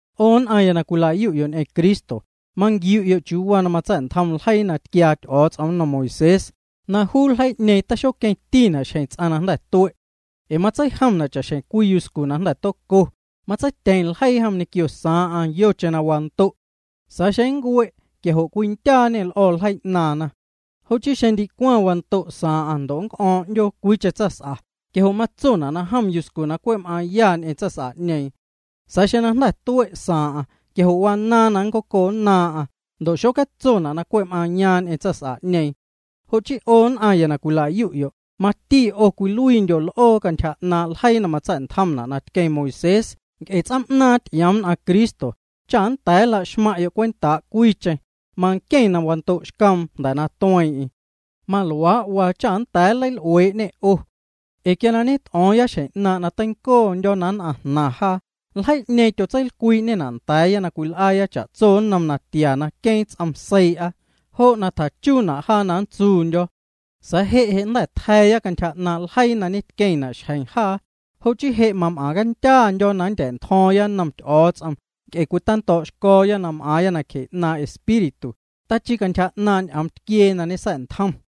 'O nn'aⁿya na cwila'yu'yo' ñ'eⁿ Cristo, manquiu'yo' chiuu waa na matsa̱'ntjom ljeii na tquiaa Ty'o̱o̱ts'om nnom Moisés, na juu ljeii'ñeeⁿ taxoqueⁿtina' xjeⁿ ts'aⁿ na jnda̱ tue'. Ee matseijomna' cha'xjeⁿ cwii yuscu na jnda̱ toco, matseityeⁿ ljeii jom ñequio saaⁿ'aⁿ yocheⁿ na wando'. Sa̱a̱ xeⁿ nncue' quia jo' cwindyaañê l'o̱ ljeii 'naaⁿna. Jo' chii xeⁿ ndicwaⁿ wando' saaⁿ'aⁿ ndo' nnc'o̱o̱ⁿ 'ndyoo cwiicheⁿ tsaⁿs'a quia jo' matsona' na jom yuscu na cwe' m'aaⁿya ñ'eⁿ tsaⁿs'a'ñeeⁿ. Sa̱a̱ xeⁿ na jnda̱ tue' saaⁿ'aⁿ quia jo' wanaaⁿ na nncoconnaaⁿ'aⁿ ndo' xocatsona' na cwe' m'aaⁿyaaⁿ ñ'eⁿ tsaⁿ'ñeeⁿ. Jo' chii 'o nn'aⁿya na cwila'yu'yo', mati 'o cwiluiindyo' l'oo cantyja 'naaⁿ' ljeii na matsa̱'ntjomna' na tqueⁿ Moisés nc'e ts'oom'naaⁿ ty'ioom nn'aⁿ Cristo, cha na nnda̱a̱ nla'xmaⁿ'yo' cwentaa' cwiicheⁿ, manqueⁿ na wando'xcoom jnda̱ na tueeⁿ'eⁿ. Maluaa' waa cha nnda̱a̱ nleil'uee'ñê 'o. Ee quia na ñet'o̱o̱ⁿya xjeⁿ 'naaⁿ' na teincoondyo̱ na nn'aⁿ jnaⁿ jaa, ljeii'ñeeⁿ tyotseilcwii'ñena' nda̱a̱ya na cwil'aaya cha'tso nnom natia na queeⁿ ts'om seii'a, jo' na tjachuuna' jaa na nntsuundyo̱. Sa̱a̱ je' je' jnda̱ tja̱a̱ya cantyja 'naaⁿ' ljeii na ñetqueⁿna' xjeⁿ jaa, jo' chii je' mam'aⁿcandyaandyo̱ na nndya̱'ntjo̱o̱ⁿya nnom Ty'o̱o̱ts'om nc'e cwitando̱o̱'xco̱o̱ya na m'aaⁿya nacje 'naaⁿ' Espíritu, tachii cantyja 'naaⁿ' ñ'oom tquiee na ñesa̱'ntjom.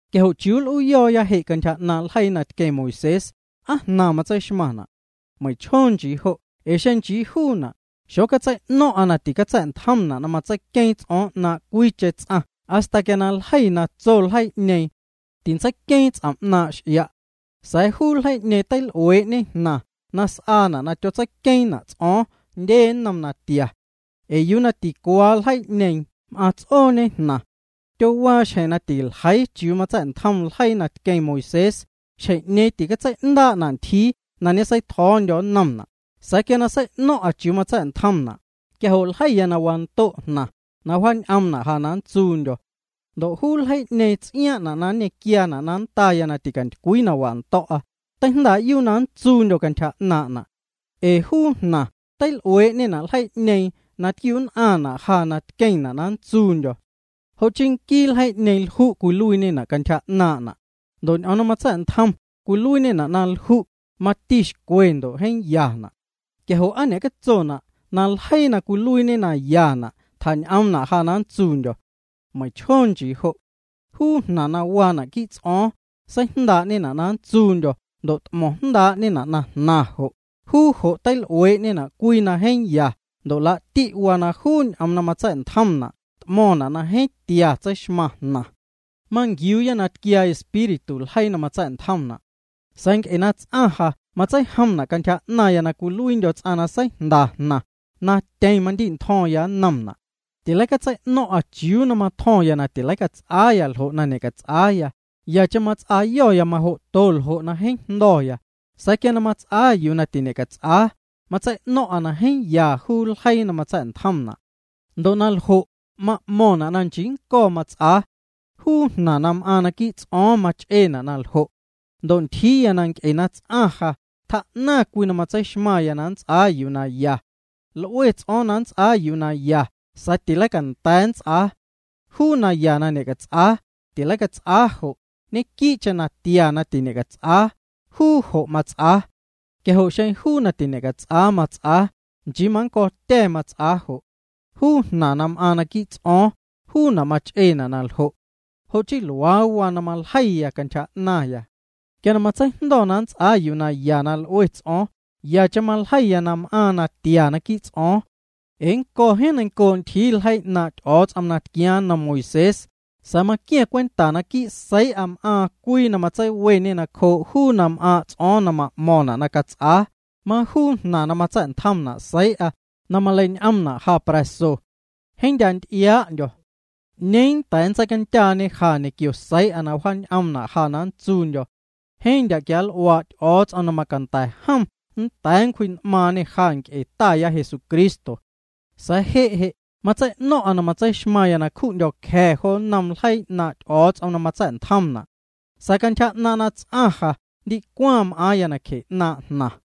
Quia jo' ¿chiuu nl'uuyo̱o̱ya je' cantyja 'naaⁿ ljeii na tqueⁿ Moisés, aa jnaⁿ matseixmaⁿna'? Meiⁿchjoo nchii jo' ee xeⁿ nchii juuna', xocatsei'no̱ⁿ'a na ticatsa̱'ntjomna' na matseiqueeⁿ ts'o̱o̱ⁿ 'naaⁿ' cwiicheⁿ ts'aⁿ hasta quia ljeiya na tso ljeii'ñeeⁿ: “Tintseiqueeⁿ ts'om' 'naaⁿ' x'ia'”. Sa̱a̱ juu ljeii'ñeeⁿ teil'uee'ñe jnaⁿ na s'aana' na tyotseiqueeⁿna' ts'o̱o̱ⁿ jndye nnom natia. Ee yuu na ticuaa ljeii'ñeeⁿ m'aaⁿ ts'ooñe jnaⁿ. Tyowaa xjeⁿ na tîcaljeii chiuu matsa̱'ntjom ljeii na tqueⁿ Moisés, xjeⁿ'ñeeⁿ tîcatsei'ndaa'na' ntyjiiya na ñeseitjo̱o̱ndyo̱ nnomna', sa̱a̱ quia na sei'no̱ⁿ'a chiuu matsa̱'ntjomna', quia jo' ljeiya na wando' jnaⁿ, na wjaañ'oomna' ja na ntsuundyo̱. Ndo' juu ljeii'ñeeⁿ na ts'iaaⁿ'na' na nñequiaana' na nndaya na ticantycwii na wando̱'a, teijndaa'yuu na nntsuundyo̱ cantyja 'naaⁿ'na'. Ee juu jnaⁿ teil'uee'ñena' ljeii'ñeeⁿ na tquiu'nn'aⁿna' ja ndo' tqueⁿna' na nntsuundyo̱. Jo' chii nquii ljeii'ñeeⁿ lju' cwiluiiñena' cantyja 'naaⁿ'na', ndo' ñ'oom na matsa̱'ntjom cwiluiiñena' na lju', mati xcwe ndo' jeeⁿ yana'. Quia jo' ¿aa ñe'catsona' na ljeii na cwiluiiñe na yana' tjañ'oomna' ja na nntsuundyo̱? Meiⁿchjoo nchii ljo'. Juu jnaⁿ na waana' quii' ts'o̱o̱ⁿ, seijndaa'ñena' na nntsuundyo̱ ndo' t'mo̱ⁿ jndaa'ñena' na jnaⁿ jo', juu jo' teil'uee'ñena' cwii na jeeⁿ ya ndo' laa'ti waa na juu ñ'oom na matsa̱'ntjomna' t'mo̱ⁿna' na jeeⁿ tia tseixmaⁿ jnaⁿ. Manquiuuya na tquiaa Espíritu ljeii na matsa̱'ntjomna'. Sa̱a̱ nc'e na ts'aⁿ ja matseijomna' cantyja 'naⁿya na cwiluiindyo̱ ts'aⁿ na seijnda jnaⁿ, na tyeⁿ mandi'ntjo̱ⁿya nnomna'. Tileicatsei'no̱ⁿ'a chiuu na matjo̱ⁿya na tileicats'aaya ljo' na ñe'cats'aa, yacheⁿ mats'aayo̱ya majo'to ljo' na jeeⁿ jndo̱ya. Sa̱a̱ quia na mats'aa yuu na tiñe'cats'aa, matsei'no̱ⁿ'a na jeeⁿ ya juu ljeii na matsa̱'ntjomna'. Ndo' na ljo', ma'mo̱ⁿna' na nchii nnco̱ mats'aa. Juu jnaⁿ na m'aaⁿ naquii' ts'o̱o̱ⁿ mach'eena' na ljo'. Ndo' ntyjiiya nc'e na ts'aⁿ ja, tjaa'naⁿ cwii na matseixmaⁿya na nts'aa yuu na ya. L'ue ts'o̱o̱ⁿ na nnts'aa yuu na ya sa̱a̱ leicanda̱a̱ nnts'aa. Juu na ya na ñe'cats'aa, ticats'aa jo', ñequii'cheⁿ natia na tiñe'cats'aa, juu jo' mats'aa. Quia jo' xeⁿ juu na tiñe'cats'aa mats'aa, nchii mannco̱tya̱ mats'aa jo'. Juu jnaⁿ na m'aaⁿ quii' ts'o̱o̱ⁿ, juuna' mach'eena' na ljo'. Jo' chii luaa waa na maljeiya cantyja 'naⁿya. Quia na matseijndo̱ na nnts'aa yuu na ya na l'ue ts'o̱o̱ⁿ, yacheⁿ maljeiya na m'aaⁿ natia naquii' ts'o̱o̱ⁿ. Ee nnco̱ jeeⁿ neiⁿncoo' ntyjii ljeii 'naaⁿ' Ty'o̱o̱ts'om na tquiaaⁿ nnom Moisés, sa̱a̱ maqua̱ⁿ cwenta naquii' seii'a m'aaⁿ cwii na matseiweñe nacjoo' juu na m'aaⁿ' ts'o̱o̱ⁿ na ma'mo̱ⁿna' na cats'aa, majuu jnaⁿ na matsa̱'ntjomna' seii'a, na maleiñ'oomna' ja pra̱so. Jeeⁿ ndya' nty'iaa'ndyo̱. ¿'Ñeeⁿ nnda̱a̱ nntseicandyaañe ja ñequio seii'a na wjaañ'oomna' ja na nntsuundyo̱? Jeeⁿ ndya' quianl'uaa' Ty'o̱o̱ts'om na macanda̱ jom nnda̱a̱ nncwji'n'maaⁿñê ja nc'e Taya Jesucristo. Je' je' matsei'no̱ⁿ'a na tseixmaⁿya na cju'ndyo̱ cja̱ jo nnom ljeii 'naaⁿ' Ty'o̱o̱ts'om na matsa̱'ntjomna'. Sa̱a̱ cantyja 'naaⁿ' na ts'aⁿ jnaⁿ ja ndicwaⁿ m'aaⁿya nacje 'naaⁿ' jnaⁿ.